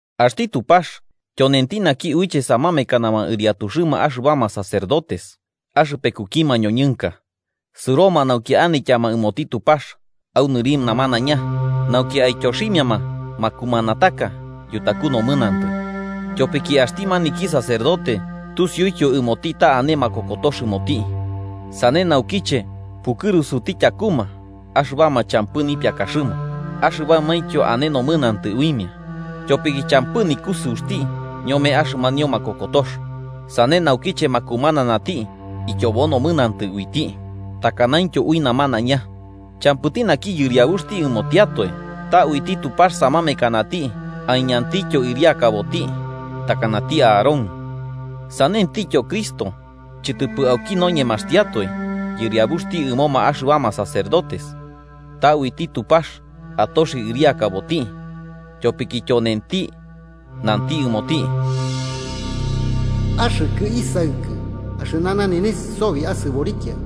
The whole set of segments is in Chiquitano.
Axti Tupax tyonenti naki uiche samamekanama ɨriatuxɨma axɨbama sacerdotes axɨpekuki mañoñɨnka, sɨroma nauki anityanama ɨmoti Tupax au nɨri namanaiña nauki aityoximiama makumanataka yutaku nomɨnantɨ. Tyopiki axti maniki sacerdote tusiutyo ɨmoti ta ane makokotox ɨmoti, sane naukiche pukɨrusuti tyakuma axɨbama champɨ nipiakaxɨma axɨbamaintyo ane nomɨnantɨ uimia. Tyopiki champɨ nikusɨuxti ñome axɨmanio makokotox, sane naukiche makumananati tyobo nomɨnantɨ uiti takanaintyo ui namanaiña. Champɨti naki yɨriabuxti ɨmotiatoe, ta uiti Tupax samamekanati aiñantityo ɨriakaboti, takanati Aarón. Sanentityo Cristo, chɨtɨpɨ auki noñemaxtiatoe yɨriabuxti ɨmoma axɨbama sacerdotes, ta uiti Tupax atoxi ɨriakaboti, tyopiki tyonenti nanti ɨmoti: “Axɨkɨ Isaɨkɨ. Axɨna nanenes sobi asɨborikia.”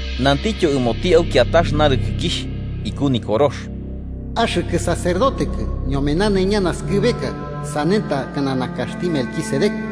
Nantityo ɨmoti au kiatax narɨkɨkixh iku Nikorox: “Axɨkɨ sacerdotekɨ ñome nanaiña naskɨbeka, sane takana nakaxti Melquisedec.”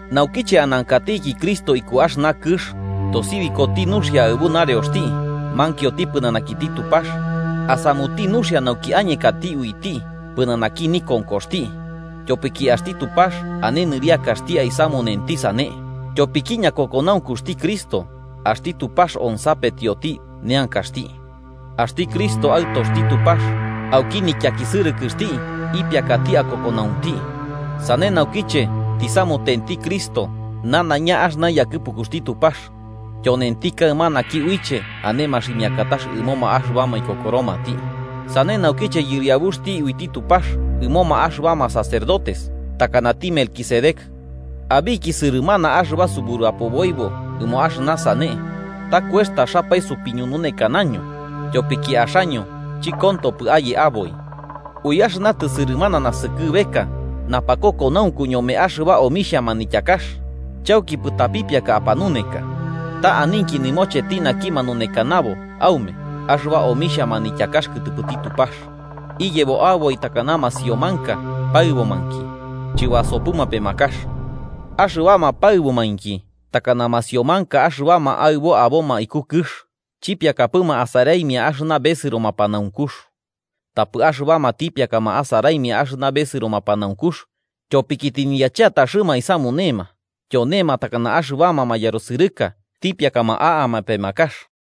Naukiche anankatiki Cristo iku axɨna kɨx, tosibikoti nuxia aɨbu nareoxti mankioti pɨnanakiti Tupax asamuti nuxia nauki añekati uiti pɨnanaki nikonkoxti, tyopiki axti Tupax ane nɨriakaxti aisamunenti sane. Tyopiki ñakokonaunkuxti Cristo, axti Tupax onsapetioti neankaxti. Axti Cristo Aɨtoxti Tupax, auki nityakisɨrɨkɨxti ipiakati akokonaunti. Sane, naukiche tisamutenti Cristo nanaiña axɨna yakɨpukuxti Tupax, tyonenti kaɨma naki uiche ane maximiakatax ɨmoma axɨbama ikokoromati, sane naukiche yɨriabuxti uiti Tupax ɨmoma axɨbama sacerdotes, takanati Melquisedec. Abiki sɨrɨmana axɨba suburapoboibo ɨmo axɨna sane, ta kuextaxapae sopiñununekanaño, tyopiki axaño chɨkontopɨ aye aboi. Ui axɨna tɨsɨrɨmana naskɨbeka napakokonaunku ñome axɨba omixhia manityakax, chaukipɨ tapipiaka apanuneka. Ta aninki nɨmocheti naki manunekanabo aume axɨba omixhia manityakax kɨtɨpɨti Tupax. Iyebo aboi takana masiomanka paɨbomainki, chɨbasopɨma pemakax, axɨbama paɨbomainki takana masiomanka axɨbama aɨbo aboma iku kɨx, chipiakapɨma asaraimia axɨna besɨro mapanaunkux. Tapɨ axɨbama tipiakama asaraimia axɨna besɨro mapanaunkux, tyopiki tɨniyachetaxɨma aisamunema, tyonema takana axɨbama mayarusɨrɨka tipiakama a'ama pemakax.